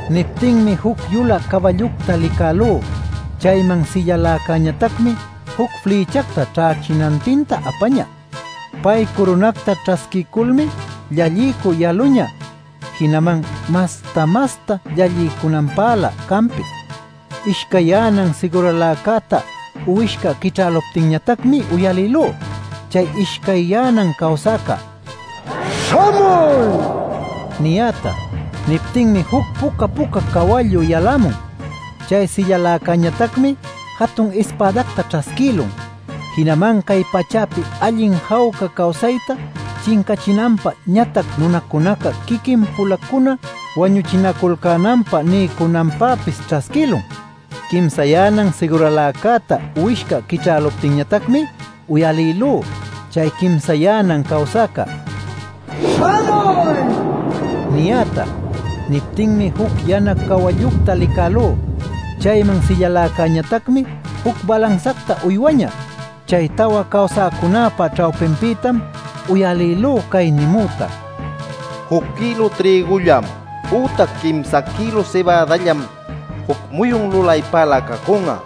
Niptinmi juc yulä cawallucta licälú. Chayman sillaläcäñatacmi juc flïchacta ćhächinantinta apañä. Pay curunacta ćhasquiyculmi llalliycü yaluñä jinaman masta-masta llalliycunanpälä canpis. Ishcayyänan siguraläcäta uwishca quićhäluptinñatacmi uyalïlú chay ishcayyänan cawsäca “¡Śhamuy!” niyäta. Niptinmi juc puca-puca cawallu yalämun. Chay sillaläcäñatacmi jatun ispädacta ćhasquïlun. Jinaman cay pachäpi allin jawca cawsayta chincachinanpä ñatac nunacunaca quiquin-pulacuna wañuchinaculcänanpä niycunanpäpis ćhasquïlun. Quimsayänan siguraläcäta uwishca quićhäluptinñatacmi uyalïlú chay quimsayänan cawsäca “¡Śhamuy!” niyäta. Niptinmi juc yana cawallucta licälú. Chayman sillaläcäñatacmi juc balansacta uywañä. Chay tawa cawsäcunäpa ćhawpinpïtam uyalïlú cay nimüta: “Juc kïlu trïgullam ütac quimsa kïlu sibädallam juc muyun lulaypälä cacun'a;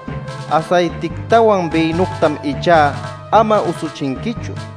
asaytictawan bïnütam ichá ama usuchinquichu” nil.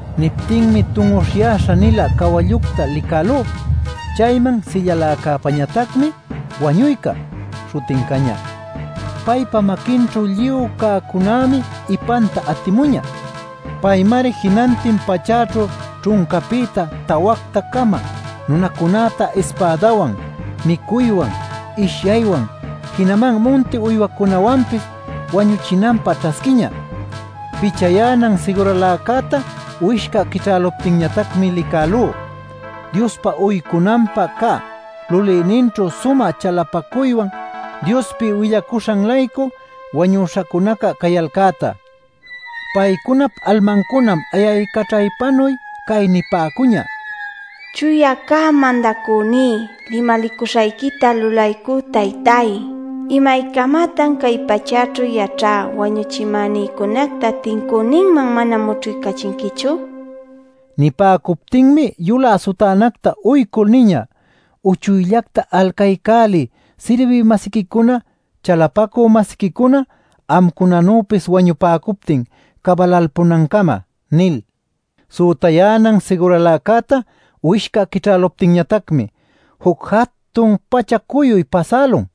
Niptinmi tun'uśhyäśha-nilä cawallucta licälú. Chayman sillaläcäpañatacmi “Wañuyca” śhutin cañä; paypa maquinćhu lluy cäcunämi ipanta atimuñä. Paymari jinantin pachäćhu ćhuncapïta tawacta-cama nunacunäta ispädawan, micuywan, ishyaywan, jinaman munti uywacunawanpis wañuchinanpä ćhasquiñä. Pichayänan siguraläcäta uwishca quićhäluptinñatacmi licälú Diospä uycunanpä cä lulïninćhu sumä chalapacuywan Diospi willacuśhan-laycu wañüśhacunaca cayalcäta. Paycunap almancunam ayaycaćhaypanuy cay nipäcuñä: “Chuya cä Mandacüní, limalicuśhayquita lulaycü Taytay ¿imaycamatan cay pachäćhu yaćhä wañuchimänïcunacta tincüninman mana mućhuycachinquichu?” nil. Nipäcuptinmi yulä sutänacta uycul niñä: “Uchuyllacta alcaycäliy sirbï-masiquicunaca, chalapacü-masiquicuna amcunanüpis wañupäcuptin cabalalpunancama” nil. Sütayänan siguraläcäta uwishca quićhäluptinñatacmi juc jatun pacha-cuyuy pasälun.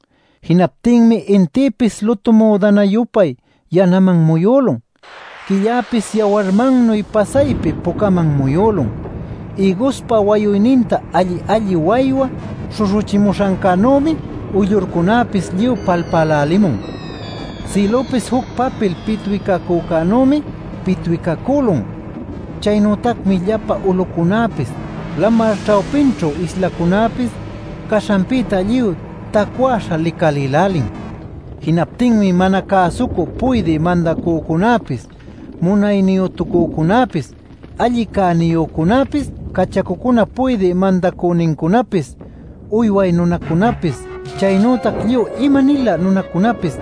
Jinaptinmi intïpis lutu müdana-yupay yanaman muyülun, quilläpis yawarmannuy pasaypi pucaman muyülun. Ïguspa wayuyninta alli-alli waywa śhuśhuchimuśhancänümi uyllurcunäpis lluy palpälälimun. Sïlüpis juc papil pitwicacücänümi pitwicacülun. Chaynütacmi llapa ulucunäpis, lamar ćhawpićhu islacunäpis caśhanpïta lluy tacwäśha licalïlälin. Jinaptinmi mana cäsucü puydï mandacücunäpis, munayniyütucücunäpis, alli cäniyücunäpis, cachacucunap puydï mandacünincunapis, uyway nunacunäpis, chaynütac lluy ima-nilä nunacunapis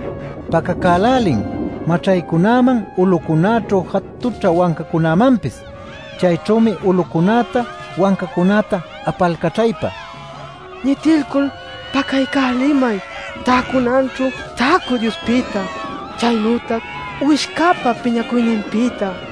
pacacälälin maćhaycunäman, ulucunäćhu jatućhä wancacunämanpis. Chayćhümi ulucunäta, wancacunäta apalcaćhaypa: “¡Ñitilcul pacaycälimay täcunanćhu täcü Diospïta, chaynütac Uwishcäpa piñacuyninpïta.